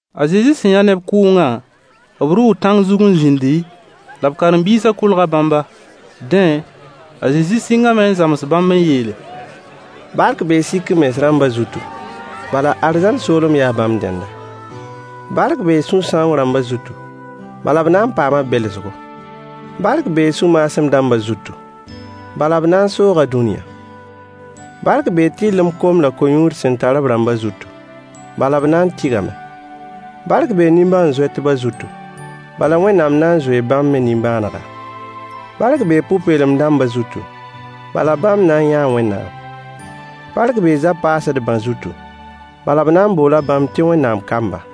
A Zezi sẽn yã neb kʋʋngã, b rʋʋ tãng zug n zĩndi, la b karen-biisã kolga bãmba. Dẽ a Zezi sɩngame n zãms bãmb n yeele: Bark bee sik-m-mens rãmbã zutu, bala arzãn soolem yaa bãmb dẽnda. Bark bee sũ-sãoong rãmbã zutu, bala b na n paama belsgo. Bark bee sũ-maasem dãmbã zutu, bala b na n sooga dũniyã. Bark bee tɩrlem kom la a ko-yũud sẽn tar b rãmbã zutu, bala b na n tɩgame. Bark bee nimbãan-zoɛtbã zutu, bala Wẽnnaam na n zoee bãmb me nimbãanega. Bark bee pʋ-peelem dãmbã zutu, bala bãmb na n yãa Wẽnnaam. Bark bee zab-paasdbã zutu, bala b na n boola bãmb tɩ Wẽnnaam kamba.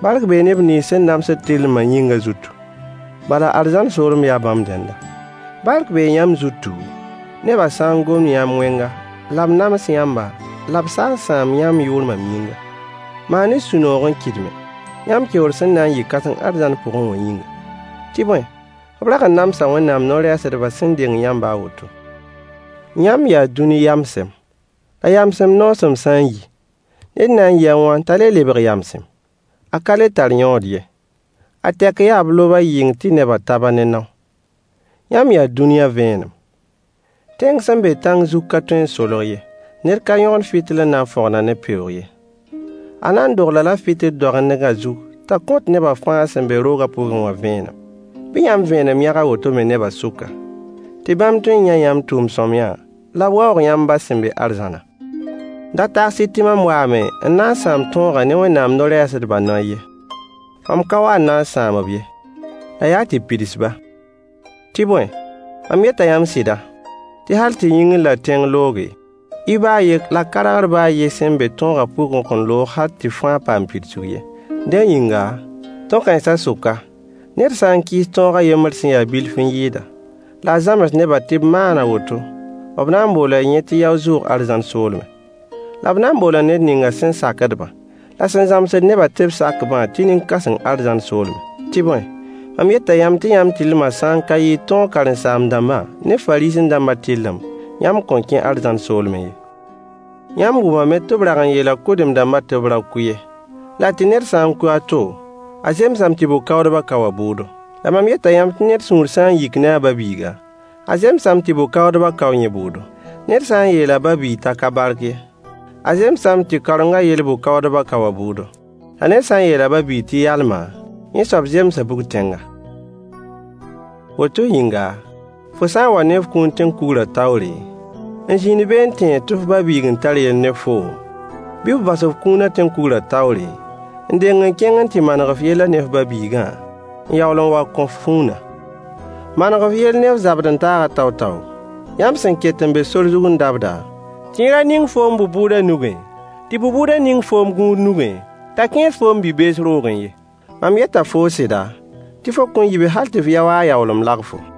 Bark bee neb nins sẽn namsd tɩrlma yĩngã zutu, bala arzãn soolem yaa bãmb dẽnda. Bark bee yãmb zutu, nebã sã n gom yãmb wẽnga la b nams yãmba la b sa n sãam yãmb yʋʋr mam yĩnga. Maan-y sũ-noog n kɩdme, yãmb keoor sẽn na n yɩ kãseng arzãn pʋgẽ wã yĩnga. Tɩ bõe, b rag n namsa Wẽnnaam no-rɛɛsdbã sẽn deng yãmbã a woto. Yãmb yaa dũni yamsem. La yamsem noosem sã n yi, ned na n yɩ a wãn t'a le lebg yamsem? A ka le tar yõod ye, a tɛk yaa b lob-a yɩng tɩ nebã tab-a ne nao. Yãmb yaa dũniyã vẽenem. Tẽng sẽn be tãng zug ka tõe n solg ye. Ned ka yõgend fɩtɩl n na n fõgen-a ne peoog ye. A na n dogl-a-la fɩtɩl doagendgã zug t'a kõt neba fãa sẽn be roogã pʋgẽ wã vẽenem. Bɩ yãmb vẽenem yãg a woto me nebã sʋka, tɩ bãmb tõe n yã yãmb tʋʋm sõamyã la b waoog yãmb ba sẽn be arzãnã. Da tags-y tɩ mam waame n na n sãam tõogã ne Wẽnnaam no-rɛɛsdbã noy ye. Mam ka wa n na n sãam-b ye, la yaa tɩ pids-ba. Tɩ bõe, mam yeta yãmb sɩda, tɩ hal tɩ yĩngr la tẽng looge, i ba a ye la kargr ba a yen sẽn be tõogã pʋgẽ kõn loog hal tɩ fãa paam pidsg ye. Dẽ yĩnga, tõ-kãensã sʋka, ned sã n kɩɩs tõog a yembr sẽn ya-a bilf n yɩɩda, la a zãms nebã tɩ b maan a woto, b na n boola yẽ tɩ yao-zʋʋg arzãn soolmẽ. La b na n boola ned ninga sẽn sakd-bã, la sẽn zãmsd nebã tɩ b sak-bã tɩ nin-kãseng arzãn soolmẽ. Tɩ bõe, mam yeta yãmb tɩ yãmb tɩrlmã sã n ka yɩɩg tõog karen-saam-dãmbã ne Fariisẽ-dãmba tɩrlem, yãmb kõn kẽ arzãn soolmẽ ye. Yãmb wʋmame tɩ b rag n yeela kʋdem-dãmbã tɩ b ra kʋ ye, la tɩ ned sã n kʋ a to, a zemsame tɩ bʋ-kaoodbã kao a bʋʋdo. La mam yeta yãmb tɩ ned sũur sã n yik ne a ba-biiga, a zemsame tɩ bʋ-kaoodbã kao yẽ bʋʋdo. Ned sã n yeel a ba-biig t'a ka bark ye, a zemsame tɩ kaorengã yɛl bʋ-bʋʋdbã kao a bʋʋdo. La ned sã n yeel a ba-biig tɩ yalma, yẽ soab zemsa bug-tẽnga. Woto yĩnga, fo sã n wa ne kũun tẽn-kugrã taoore, n zĩnd be n tẽeg tɩ f ba-biig n tar yell ne foom, bɩ f bas f kũunã tẽn-kugrã taoore, n deng n kẽng n tɩ maneg f yellã ne f ba-biigã, n yaool n wa kõ f kũunã. Maneg f yell ne f zabd-n-taag tao-tao, yãmb sẽn ket n be sor zug n dabda, tɩ yẽ ra ning foom bʋ-bʋʋdã nugẽ, tɩ bʋ-bʋʋdã ning foom gũud nugẽ t'a kẽes foom bi-bees roogẽ ye. Mam yeta foo sɩda, tɩ fo kõn yi be hal tɩ f yao-a a yaoolem lagfo.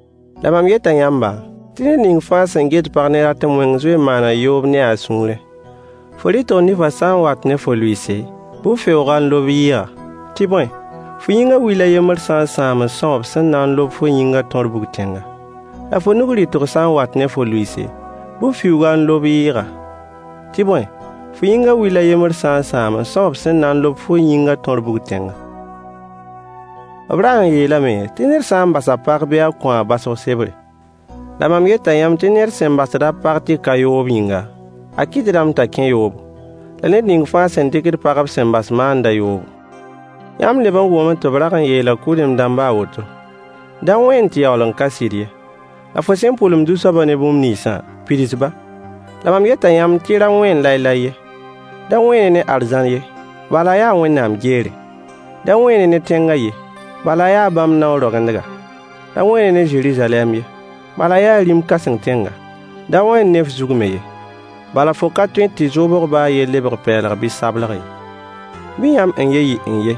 La mam yeta yãmb tɩ ned ning fãa sẽn get pag ne ratem wẽng zoe n maana yoob ne-a a sũurẽ. Fo rɩtg nifã sã n wat ne fo lʋɩɩs bɩ f feoog-a n lob yɩɩga, tɩ bõe, fo yĩngã will a yembr sã n sãam n são b sẽn na n lob fo yĩngã tõr bug-tẽnga. La fo nug rɩtg sã n wat ne fo lʋɩɩs bɩ f fiuug-a n lob yɩɩga, tɩ bõe, fo yĩngã will a yembr sã n sãam n são b sẽn na n lob fo yĩngã tõr bug-tẽnga. B rag n yeelame tɩ ned sã n bas a pag bɩ a kõ-a baosg sebre. La mam yeta yãmb tɩ ned sẽn basd a pag tɩ ka yoob yĩnga, a kɩtdame t'a kẽ yoobo. La ned ning fãa sẽn dɩkd pag b sẽn bas maanda yoobo. Yãmb leb n wʋmame tɩ b rag n yeela kʋdem dãmbã a woto: “Da wẽen tɩ yaool n ka sɩd ye, la fo sẽn pʋlem Zu-soabã ne bũmb ninsã, pids-ba.” La mam yeta yãmb tɩ ra wẽen lae-lae ye. Da wẽen-y ne arzãn ye, bala a yaa Wẽnnaam geere. Da wẽen-y ne tẽngã ye, bala a yaa bãmb nao roagendga. Da wẽen-y ne Zeruzalɛm ye, bala a yaa rĩm-kãseng tẽnga. Da wẽen ne f zug me ye, bala fo ka tõe tɩ f zoobg ba a yen lebg pɛɛlg bɩ sableg ye. Bɩ yãmb n-ye yɩ n-ye,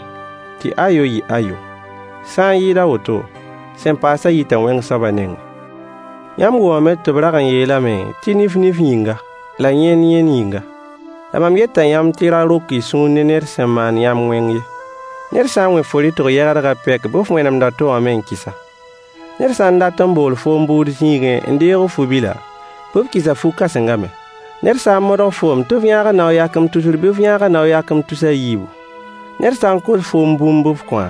tɩ y ayo yɩ ayo. Sã n yɩɩd a woto, sẽn paasã yita wẽng soabã nengẽ. Yãmb wʋmame tɩ b rag n yeelame tɩ nif nif yĩnga, la yẽnd yẽnd yĩnga. La mam yeta yãmb tɩ y ra rok y sũur ne ned sẽn maand yãmb wẽng ye. Ned sã n wẽ fo rɩtg yɛgdgã pɛk bɩ f wẽnemd a to wã me n kis-a. Ned sã n dat n bool foom bʋʋd zĩigẽ n deeg f fu-bila, bɩ f kɩs-a fu-kãsengã me. Ned sã n modg foom tɩ f yãag-a nao-yakem tusr bɩ f yãag-a nao-yakem tus a yiibu. Ned sã n kos foom bũmb bɩ f kõ-a.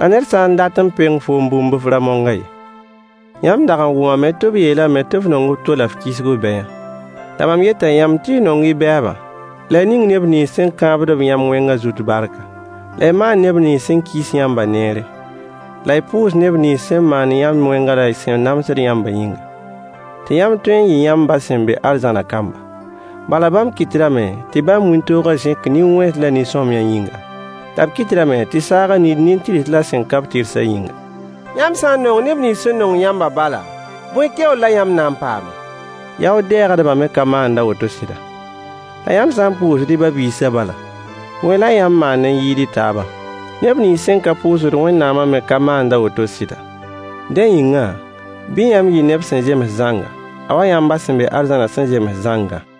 La ned sã n dat n peng foom bũmb bɩ f ra mong-a ye. Yãmb dag n wʋmame tɩ b yeelame tɩ f nong f to la f kisg f bɛya. La mam yeta yãmb tɩ y nong y bɛɛba [la y ning neb nins sẽn kãabd yãmb wẽngã zut barka, la y maan neb nins sẽn kis yãmbã neere] la y pʋʋs neb nins sẽn maand yãmb wẽnga la sẽn namsd yãmbã yĩnga, tɩ yãmb tõe n yɩ yãmb ba sẽn be arzãnã kamba. Bala bãmb kɩtdame tɩ bãmb wĩntoogã zẽk nin-wẽns la nin-sõamy yĩnga, la b kɩtdame tɩ saagã niid nin-tɩrs la sẽn ka-b tɩrsã yĩnga. Yãmb sã n nong neb nins sẽn nong yãmbã bala, bõe keoor la yãmb na n paame? Yaood-dɛɛgdbã me ka maand a woto sɩda? La yãmb sã n pʋʋsd y ba-biisã bala, bõe la yãmb maand n yɩɩd y taabã? Neb nins sẽn ka pʋʋsd Wẽnnaamã me ka maand a woto sɩda? Dẽ yĩnga, bɩ yãmb yɩ neb sẽn zems zãnga, a wa yãmb ba sẽn be arzãnã sẽn zems zãngã.